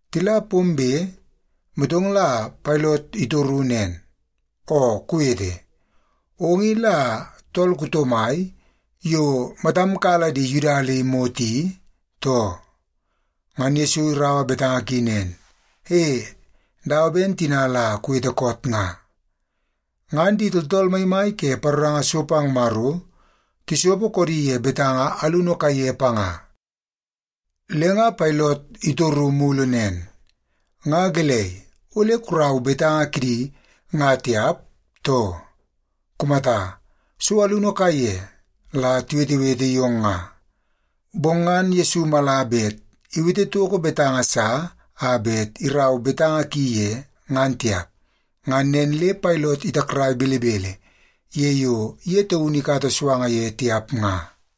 Tila pombe, motong la Pailot itoru nen, “Oo kuwete, ong i la tool kuto mai yo matam kala di Yuda le imot i, too?” Ngan Yesu iraua betanga ki nen, “E, dawa ben tina la kuwete koot nga.” Ngan di tooltool maimai ke paroranga so pang Maro tisopo koodi ye betanga alunu kaiye panga. Le nga Pailot itoru mulu nen, “Nga gelei ole kurau betanga kidi nga tiap, too? Kumata, so alunu kaiye la tiwetewete yong nga.” Bong ngan Yesu mala bet iwete toko betanga sa a bet iraua betanga ki ye, ngan tiap. Ngan nen le Pailot itakrai belebele ye yo ye taunu ikata suanga ye tiap nga.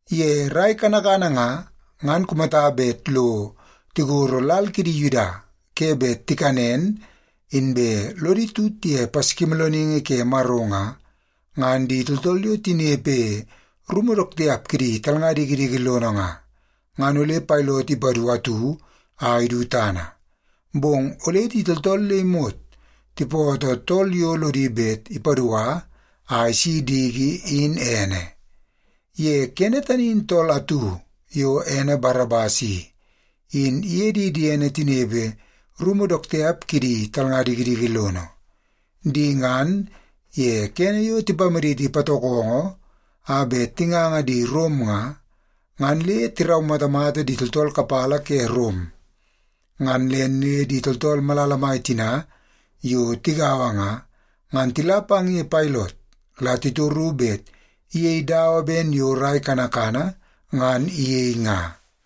Ye rai kanakana nga, ngan kumata bet lo tigoro lal kidi Yuda ke bet tikanen inbe lodi tut ye Paskimoolooningi ke Maro nga, ngan di tooltool yo tinepe rumu dook tiap kidi talnga dikidiki lono nga, ngan ole Pailot ipadu atu a idu tana. Bong ole di tooltool le imot tipootoo tool yo lodi bet ipadua a isi diki in ene. Ye kene tani in tool atu yo ene Barabas i, in iye di diene tinepe rumu dook tiap kidi talnga dikidiki lono. Di ngan ye kene yo tipamaditi patokongo a bet tinganga di Rom nga, ngan le tiraumatamata di tooltool kapala ke Rom. Ngan nen le di tooltool malala mai tina yo tigaua nga, ngan tila pang ye Pailot la titoru bet iyei dawa ben yo rai kanakana ngan iyei nga.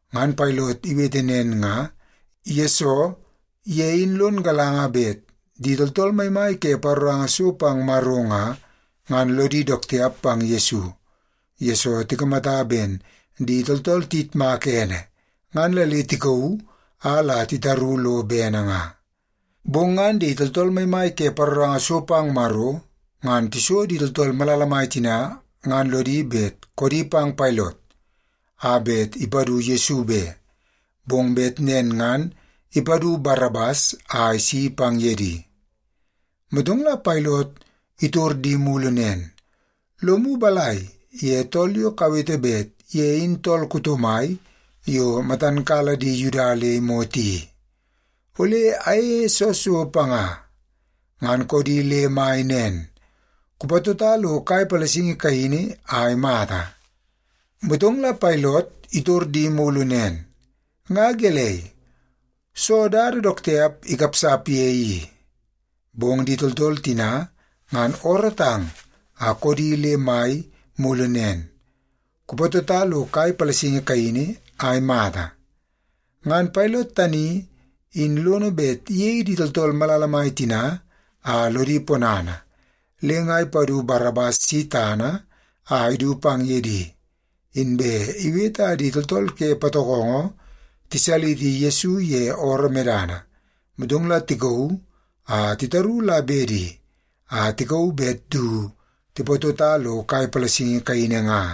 Ngan Pailot iwete nen nga, yesoo ye in lon galanga bet di tooltool maimai ke paroranga so pang Maro nga, ngan lodi dook tiap pang Yesu, yesoo tikamata ben di tooltool tiyitmaka ene, ngan la le tikauu a la titaru lo bene nga. Bong ngan di tooltool maimai ke paroranga so pang Maro ngan tiso di tooltool malala mai tina ngan lodi bet koodi pang Pailot a bet ipadu Yesu be, bong bet nen ngan ipadu Barabas a isi pang ye di. Motong la Pailot itor di mulu nen, “Lomu balai ye tool yo kawete bet ye in tool kuto mai yo matan kala di Yuda le imot i? Ole ayeie soo so panga?” Ngan koodi le mai nen, “Kupatota lo kai palasingi kaini a imata!” Motong la Pailot itor di mulu nen, “Nga gelei? Soo dada dook tiap ikapsap ye i?” Bong di tooltool tina ngan oorootang a koodi le mai mulu nen, “Kupatota lo kai palasingi kaini a imata!” Ngan Pailot tani in lono bet iyei di tooltool malala mai tina a lodi ponana, le nga ipadu Barabas si tana a idu pang ye di. Inbe iwete a di tooltool ke patokongo tisaliti Yesu ye ooroo medana, motong la ikauu a itaru la bedi a tikauu bet du tipatota lo kai palasingi kaini nga.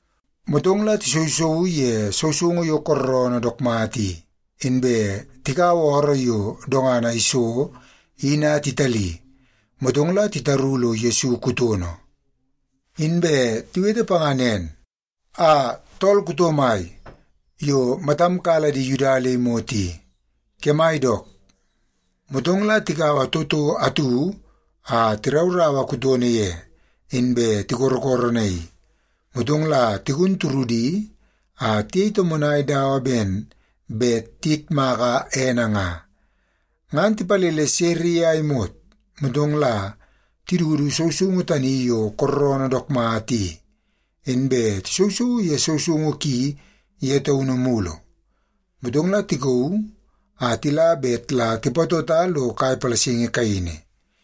Motong la tisousouu ye sousoungu yo kooroonoo dook mata i, inbe tikaua ooroo yo dongana iso in a titali, motong la titaru lo Yesu kutono. Inbe tiwete panga nen, “Aa, tool kuto mai yo matam kala di Yuda le imot i, kemai dook!” Motong la tikaua toto atu a tirauraua kutono ye, inbe tikorokoronaii. Motong la tigun turudi a tiyei tomonai dawa ben bet tiyitmak ene nga. Ngan tipalele sere ye a imot, motong la tidudu sousoungu tani yo kooroonoo dook mata i, inbe tisousouu ye sousoungu ki ye taunu mulu. Motong la tikauu a tila bet la tipatota lo kai palasingi kaini.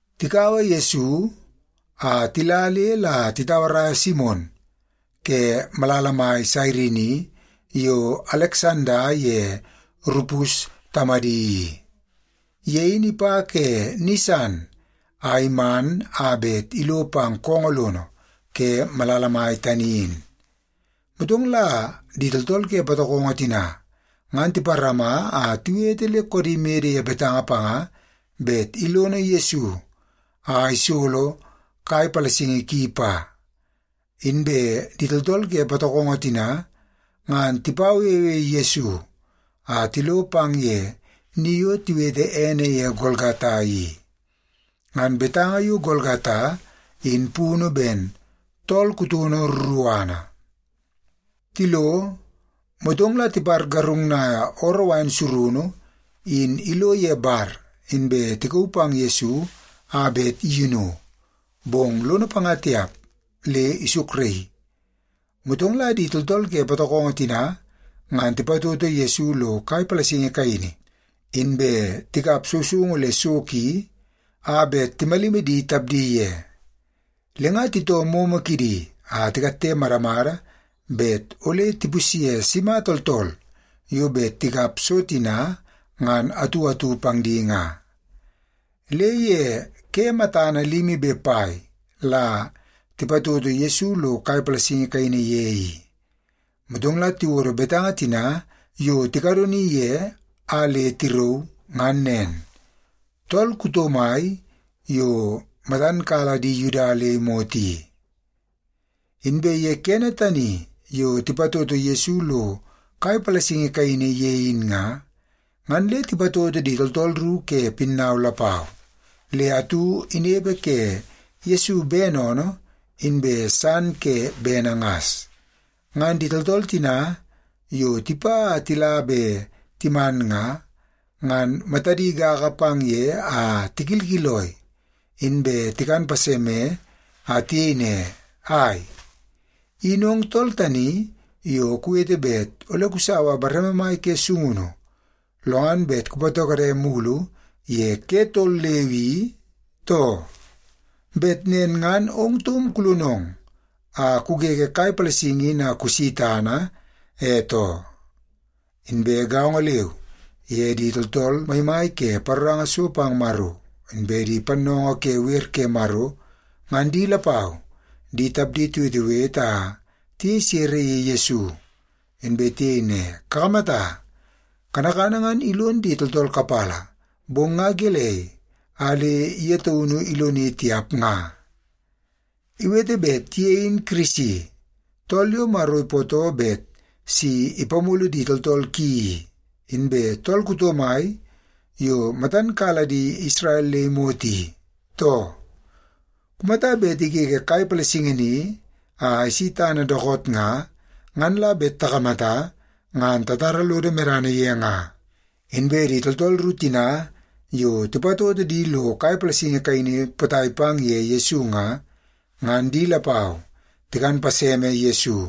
Tikaua Yesu a tila le la titauaraia Simon ke malala mai Sairini yo Aleksanda ye Rupus tamadi i. Ye in ipa ke ni san a iman a bet ilo pang koongoo lono ke malala mai tani in. Motong la di tooltool ke patokongo tina ngan tiparama a tiwete le koodi mede ye betanga panga bet ilono Yesu a isolo kai palasingi ki pa. Inbe di tooltool ke patokongo tina, ngan tipawewe Yesu a tilo pang ye ni yo tiwete ene ye Golgata i. (Ngan betanga yo Golgata in punu ben, Tool Kutono Ruruana). Tilo, motong la tipargarungnai ooroo wain surunu in ilo ye bar, inbe tikauu pang Yesu a bet iyinu. Bong lono panga tiap le isukraii. Motong la di tooltool ke patokongo tina ngan tipatoto Yesu lo kai palasingi kaini, inbe tikap sousoungu le so ki a bet timalimi di tapdi ye. Le nga titoo moomoo kidi a tikatte madamada bet ole tipusye sima tooltool yo bet tikap so tina ngan atu atu pang di nga. Le ye ke matana limi be pai la tipatoto Yesu lo kai palasingi kaini ye i. Motong la tiwodo betanga tina yo tikadoni ye a le tirauu, ngan nen: Tool Kuto Mai Yo Matan Kala Di Yuda Le Imot I. Inbe ye kene tani yo tipatoto Yesu lo kai palasingi kaini ye in nga, ngan le tipatoto di tooltool ru ke pinnau lapau. Le atu inepe ke Yesu bene oonoo, inbe san ke bene ngas. Ngan di tooltool tina yo tipa a tila be timan nga, ngan matadi gaga pang ye a tikilkiloi. Inbe tikan paseme, a tiyei ne, “Ai! In ong tool tani yo kuwete bet ole kusaua bareme mai ke sungunu, lo ngan bet kupatokode mulu ye ke tol leu i, too? Bet nen ngan ong taum kulonong a kugege kai palasingi in a kusi tana, e too.” Inbe gaongo leu ye di tooltool maimai ke paroranga so pang Maro, inbe di pannoongoo ke wer ke Maro, ngan di lapau di tapdi tiwetewete a tiyei sere ye Yesu. Inbe tiyei ne, “Kakamata, kanakana ngan ilon di tooltool kapala, bong nga gelei a le ye taunu iloni tiap nga? Iwete bet ye in Kirisi, tool yo Maro ipootoo bet si ipamulu di tooltool ki i, inbe tool kuto mai yo matan kala di Isrel le imot i, too? Kumata bet igege kai palasingi ni a isi tana dookoot nga, ngan la bet takamata, ngan tatara lodo medana ye nga.” Inbe di tooltool ru tina yo tipatoto di lo kai palasingi kaini potai pang ye Yesu nga, ngan di lapau tikan paseme Yesu.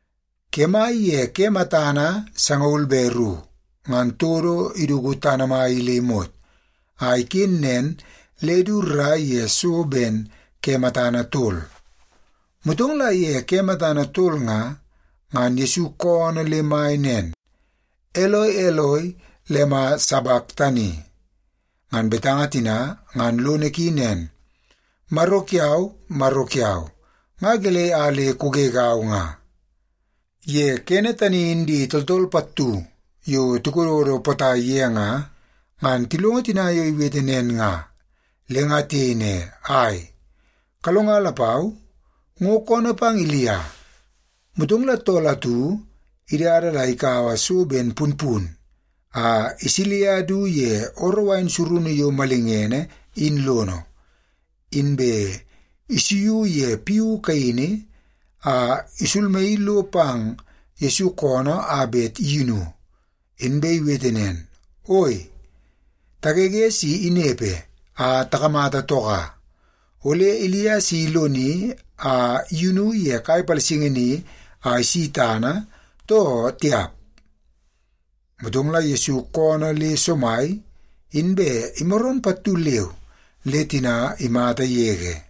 Kemai ye ke matana sangaul be ru, ngan todo iduku tana mai i le imot, a iken nen le du rrai ye so ben ke matana tol. Motong la ye ke matana tol nga, ngan Yesu koonoo le mai nen, “Eloi, Eloi, lema sabaktani?” Ngan betanga tina ngan lono ki nen, “Maro kiau, Maro kiau, nga gelei a le kugegau nga?” Ye kene tani in di tooltool pattu yo tikododo potai ye nga, ngan tilongo tina yo iwete nen nga, le nga tiyei ne, “Ai, kalonga lapau, ngo koonoo pang Ilia.” Motong la tool atu idada la ikaua so ben punpun a isilia du ye ooroo wain surunu yo malingene in lono, inbe isuiu ye piu kaini a isulmaii lo pang Yesu koonoo a bet iyinu. Inbe iwete nen, “Oi, tagege si inepe a takamata toka. Ole Ilia si iloni a iyunu ye kai palasingi ni a isi tana, too tiap?” Motong la Yesu koonoo le somai, inbe imaroon pattu leu le tina imata yege.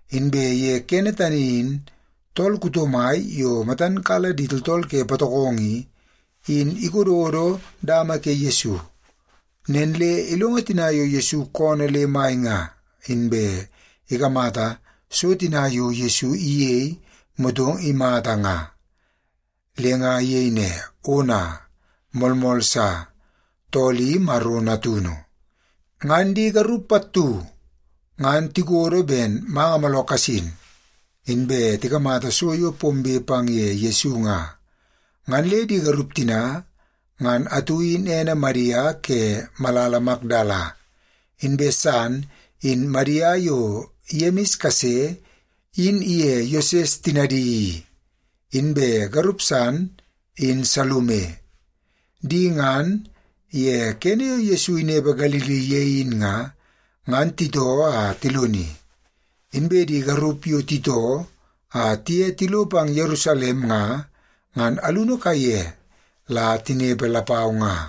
Inbe ye kene tani in tool kuto mai yo matan kala di tooltool ke patokongo i, in ikododo dama ke Yesu. Nen le ilongo tina yo Yesu koonoo le mai nga, inbe ikamata so tina yo Yesu iyei motong imata nga, le nga iyei ne, “Ona, moolmool sa, tool i Maro Natunu!” Ngan di garup pattu ngan tikodo ben manga mooloo kasin, inbe tikamata so yo pombe pang ye Yesu nga. Ngan le di garup tina, ngan atu in ene Madia ke malala Makdala, inbe san in Madia yo Yemis kase in iye Yoses tinadi i, inbe garup san in Salume. Di ngan, ye kene yo Yesu inepe Galili ye in nga, ngan titoo a tiloni. Inbe di garup yo titoo a tiye tilo pang Yerusalem nga, ngan alunu kaiye la tinepe lapau nga.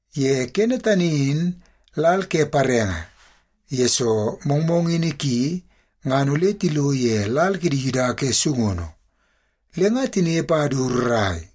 Ye kene tani in lal ke parenge, yesoo mongmongini ki ngan ole tilo ye lal kidi Yuda ke sungunu. Le nga tinepe a du rrai,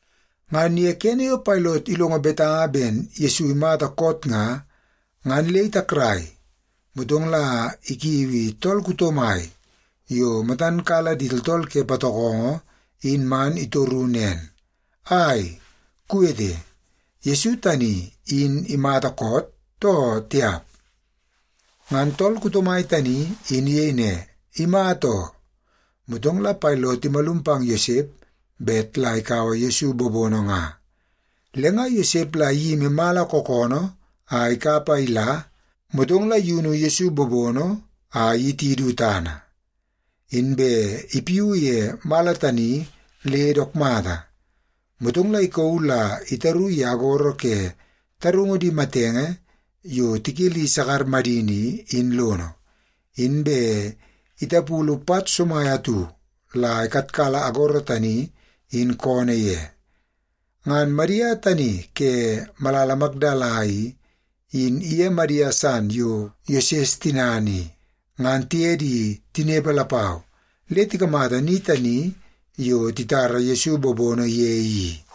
Ngan ye kene yo Pailot ilongo betanga ben Yesu imata koot nga, ngan le itakrai. Motong la ikiui tool kuto mai yo matan kala di tooltool ke patokongo in man itoru nen, “Ai, kuwete, Yesu tani in imata koot, too tiap?” Ngan tool kuto mai tani in iyei ne, “Imata oo.” Motong la Pailot imalum pang Yosep bet la ikaua Yesu bobono nga. Le nga Yosep la iyimi mala kookoonoo a ikap a ila, motong la iyunu Yesu bobono a iyiti du tana. Inbe ipiuu ye mala tani le dook mata, motong la ikauu la itaru ye agoro ke tarungu di matenge yo tikeli sakar madini i, in lono. Inbe itapulu pat somai atu la ikatkala agoro tani in koonoo ye. Ngan Madia tani ke malala Makdala i, in iye Madia san yo Yoses tinana i, ngan tiye di tinepe lapau le tikamata ni tani yo titara Yesu bobono ye i.